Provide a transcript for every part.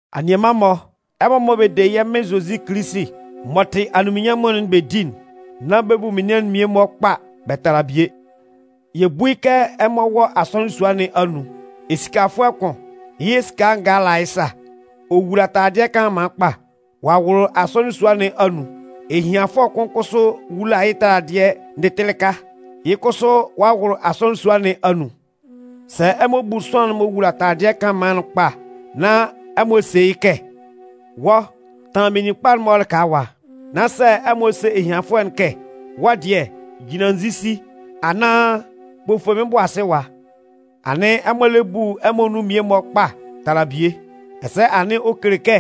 Anianman-mɔ, ɛmɔ mɔ bɛ de yɛ́ Mɩn Zozi Kilisi m'ɔ tɩ anunminnyanmʋn'n bɛ di'n, nán bɛ bu menian'n mmie-mɔ kpa bɛ tala bie. Yɛ bú yɩ́ kɛ ɛmɔ wɔ asɔnɩn sua nɩn anun, esikafʋɛ kʋn, yɩ́ esika ngaa la yɩ́ sa, ɔ wula taladɩɛ kanlanman kpa, ɔ'a wʋlʋ asɔnɩn sua nɩn anun. Ehianfʋɛ kʋn kʋsʋ wula yɩ́ taladɩɛ ndɩtɩlɩka, yɩ́ kʋsʋ ɔ'a wʋlʋ asɔnɩn sua nɩn anun. Sɛ ɛmɔ bu sʋanlan'n m'ɔ wula taladɩɛ kanlanman'n kpa nán ɛmɔ se yɩ́ kɛ: “Wɔ́, tanlan meninkpa'n-mɔ lɩka ɛwa”, nán sɛ ɛmɔ se ehianfʋɛ'n kɛ: “Wɔ́ dɩɛ, jinlan nzisi” anaan “Kpofo mɩ́n bʋ asɩ ɛwa”, anɩn ɛmɔ lɛ bu ɛmɔ nun mmie-mɔ kpa tala bie, ɛsɛ anɩn ɔ kele kɛ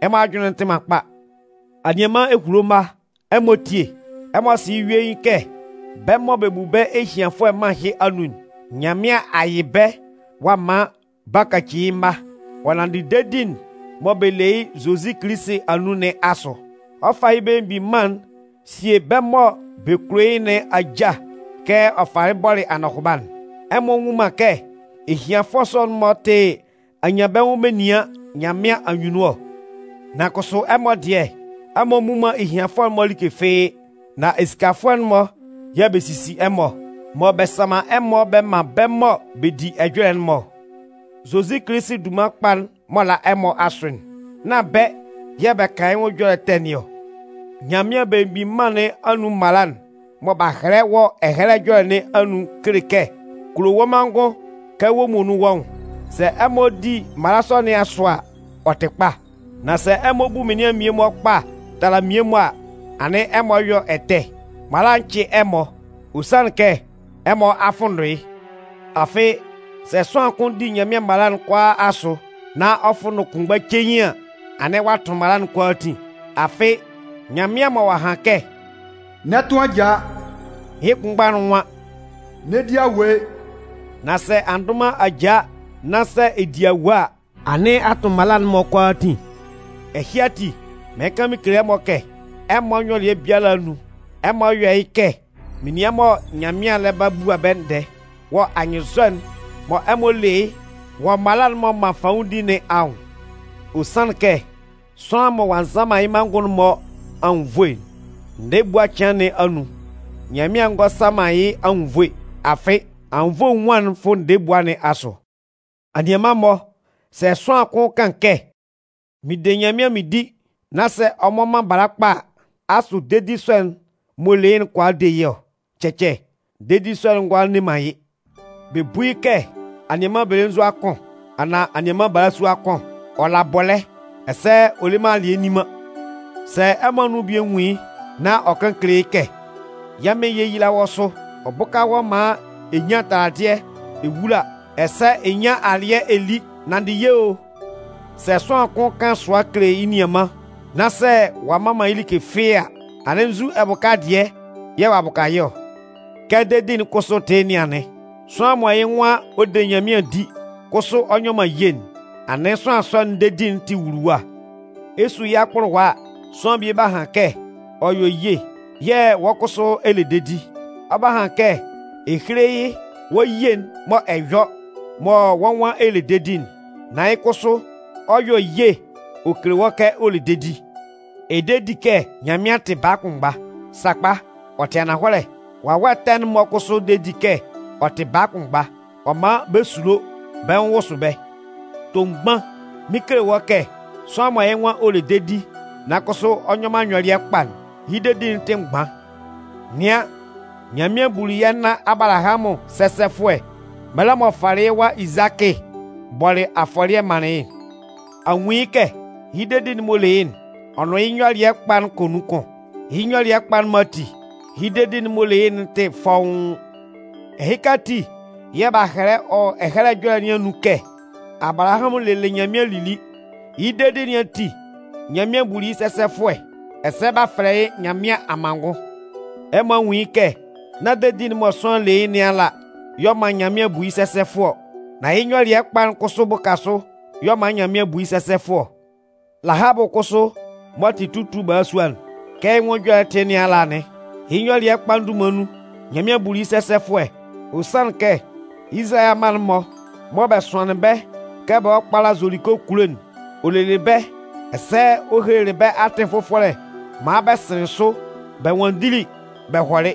ɛmɔ ajʋnlɩn'n tɩ man kpa. Anianman ehulo mma, ɛmɔ tíe. Ɛmɔ sɩ yɩ́ yuein kɛ bɛ́ mɔ bɛ bu bɛ́ ehianfʋɛ mân ɛhɩ anun'n, Nyanmɩan a yɩ bɛ́ ɔ'a man b'a kaci yɩ́ mma, ɔ nanndɩ dedi'n mɔ bɛ le yɩ́ Zozi Kilisi anun nɩn asʋ. Ɔ 'fa yɩ́ Belemgbin Mân'n sie bɛ́ mɔ bɛ kulo yɩ́ nɩn ajâ kɛ ɔ falɩ bɔlɩ anɔhʋba'n. Ɛmɔ nnwun man kɛ ehianfʋɛ sɔ'n-mɔ tɩ anyanbɛnwʋn menian Nyanmɩan anyunnun ɔ? Nan kʋsʋ ɛmɔ dɩɛ, ɛmɔ mmu man ehianfʋɛ'n-mɔ like fɩ́ɩ́. Nán esikafʋɛ'n-mɔ yɛ̂ bɛ sisi ɛmɔ, mɔ bɛ sanman ɛmɔ bɛ man bɛ́ mɔ bɛ di ɛjɔlɛ'n-mɔ ɔ? Zozi Kilisi dunman kpa'n m'ɔ la ɛmɔ asʋ'n, nán bɛ́ yɛ̂ bɛ kan yɩ́ nwʋn ɛjɔlɛ ɛtɛ nɩn ɔ? Nyanmɩan Belemgbin Mân nɩn anun mala'n mɔ b'a hɛlɛ wɔ Ɛhɛlɛ Ɛjɔlɛ nɩn anun'n kele kɛ: Kulo wɔ́ manngʋn kɛ wɔ́ muonun wɔ́ nwʋn. Sɛ ɛmɔ di mala sɔ nɩn asʋ a, ɔ tɩ kpa. Nan sɛ ɛmɔ bu menian'n mmie-mɔ kpa tala mmie-mɔ a, anɩn ɛmɔ yɔ ɛtɛ. Mala'n cɩ ɛmɔ, ɔ sanlɩn kɛ ɛmɔ a fʋnndʋn yɩ́. Afɩ, sɛ sʋanlan kʋn di Nyanmɩan mala'n kʋalaa asʋ nan ɔ fʋnndʋn kʋnmgba cein an, anɩn ɔ'a tʋn mala'n kʋalaatin. Afɩ, Nyanmɩan mɔ ɔ'a han kɛ: “N'ɛ tʋn ajaa”, yɩ́ kʋnmgba'n nwan: “N'ɛ di awue.” Nan sɛ a ndʋn man ajaa nán sɛ ɛ di awue a, anɩn a tʋn mala'n-mɔ kʋalaatin. Ɛhɩ ati, mɩɩn kan mɩn kele ɛmɔ kɛ, ɛmɔ nyɔlɩɛ biala anun, ɛmɔ yɔ́ yɩ́ kɛ menian mɔ Nyanmɩan lɛ ba bua ɛmɔ ndɛɛ wɔ anyɩnnzɔ'n mɔ ɛmɔ le yɩ́ wɔ mala m'ɔ man fanwʋndi nɩn anwʋn. Ɔ sanlɩn kɛ sʋanlan mɔ ɔ'a nza man yɩ́ manngʋn'n-mɔ anwunnvoe'n, ndɛɛ ebua cɩan nɩn anun, Nyanmɩan ngɔ sa man yɩ́ anwunnvoe. Afɩ, anwunnvoe enwuan'n fʋ ndɛɛ ebua nɩn asʋ. Anianman-mɔ, sɛ sʋanlan kʋn kan kɛ: “Mɩn de Nyanmɩan mɩn di” nan sɛ ɔ mmɔ man bala kpa a, asʋ dedi sɔ'n m'ɔ le yɩ́'n kʋala de yɩ́ ɔ? Cɛcɛ, dedi sɔ'n ngʋala nne man yɩ́. Bɛ bú yɩ́ kɛ anianman belenzua kʋn anaan anianman balasua kʋn, ɔ la bɔlɛ́ ɛsɛ ɔ le man alɩɛ nni man. Sɛ ɛmɔ anun bie nwun yɩ́ nán ɔ kan kele yɩ́ kɛ: “Yɛ́ Mɩn yéyila wɔ́ sʋ. Ɔ bʋ́ka wɔ́ maan ɛ nyán taladɩɛ ɛ wúla ɛsɛ ɛ nyán alɩɛ ɛ lí, nanndɩ ye o.” Sɛ sʋanlan kʋn kan sʋa kele yɩ́ nianman nán sɛ ɔ'a mman man yɩ́ like fɩ́ɩ́ a, anɩn nzu ɛbʋka dɩɛ yɛ̂ ɔ'a bʋka yɩ́ ɔ? Kɛ dedi'n kʋsʋ tɩ yɩ́ nɩn anɩn. Sʋanlan m'ɔ yɩ́ nwan ɔ de Nyanmɩan di, kʋsʋ ɔ nyɔ man ye'n, anɩn sʋanlan sɔ'n dedi'n tɩ wuluwa. Ɛ 'su yɩ́ akpʋlʋwa a, sʋanlan bie 'ba han kɛ ɔ yɔ ye yɛ̂ wɔ́ kʋsʋ ɛ le dedi. Ɔ 'ba han kɛ ɛ héle yɩ́ wɔ́ ye'n mɔ ɛ yɔ mɔ wɔ́ nwan ɛ le dedi'n, nan yɩ́ kʋsʋ ɔ 'yɔ ye ɔ kele wɔ́ kɛ ɔ le dedi. Ɛ de di kɛ Nyanmɩan tɩ baa kʋnmgba? Sakpa, ɔ tɩ ananhɔlɛ! Wawɛ ɛtɛ'n-mɔ kʋsʋ de di kɛ ɔ tɩ baa kʋnmgba, ɔ man bɛ sulo, bɛ́ nwʋn wʋsʋ bɛ́. Tomgban, mɩn 'kele wɔ́ kɛ sʋanlan mɔ yɩ́ nwan ɔ le dedi, nan kʋsʋ ɔ nyɔ man nyɔlɩɛ kpa'n, yɩ́ dedi'n tɩ mgban. Nɩan, Nyanmɩan buli yɛ́ nan Abalahamʋn sɛsɛfʋɛ mɛlɛ m'ɔ falɩ yɩ́ wa Izakɩ bɔlɩ afɔlɩɛ manlɩn yɩ́'n. A nwun yɩ́ kɛ? Yɩ́ dedi'n m'ɔ le yɩ́'n, ɔ nʋn yɩ́ nyɔlɩɛ kpa'n kɔ nun kʋn. Yɩ́ nyɔlɩɛ kpa'n-mɔ ati, yɩ́ dedi'n m'ɔ le yɩ́'n tɩ fɔ́ʋ́n. Ɛhɩka ati yɛ̂ b'a hɛlɛ wɔ Ɛhɛlɛ Ɛjɔlɛ nɩn anun kɛ: Abalahamʋn lelɩ Nyanmɩan lili. Yɩ́ dedi nɩn ati, Nyanmɩan buli yɩ́ sɛsɛfʋɛ. Ɛsɛ b'a fɛlɛ yɩ́ Nyanmɩan amanngʋn. Ɛmɔ a nwun yɩ́ kɛ nán dedi'n mɔ sʋanlan le yɩ́ nɩn ala y'ɔ man Nyanmɩan bu yɩ́ sɛsɛfʋɛ ɔ. Nan yɩ́ nyɔlɩɛ kpa'n kʋsʋ bʋka sʋ y'ɔ man Nyanmɩan bu yɩ́ sɛsɛfʋɛ ɔ. Lahabʋ kʋsʋ m'ɔ tɩ tutu balasua'n, kɛ yɩ́ nwʋn ɛjɔlɛ'n tɩ yɩ́ nɩn ala anɩn. Yɩ́ nyɔlɩɛ kpa'n dunman nun, Nyanmɩan buli yɩ́ sɛsɛfʋɛ. Ɔ sanlɩn kɛ Izalayɛ amma'n-mɔ mɔ bɛ sʋanlɩn bɛ́ kɛ bɛ hɔ́ kpála Zoliko kulo'n, ɔ lelɩ bɛ́, ɛsɛ ɔ helelɩ bɛ́ atɩn fʋfɔlɛ maan bɛ sɩnlɩn sʋ bɛ nwanndili bɛ hɔlɩ.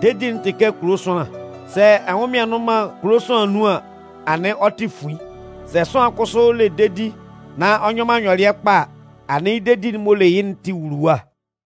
Dedi'n tɩ kɛ kulo sʋanlan. Sɛ ɛnwʋnmɩan nnʋn man kulo sʋanlan anun an, anɩn ɔ tɩ fuin. Sɛ sʋanlan kʋsʋ le dedi nan ɔ nyɔ man nyɔlɩɛ kpa a, anɩn yɩ́ dedi'n m'ɔ le yɩ́'n tɩ wuluwa.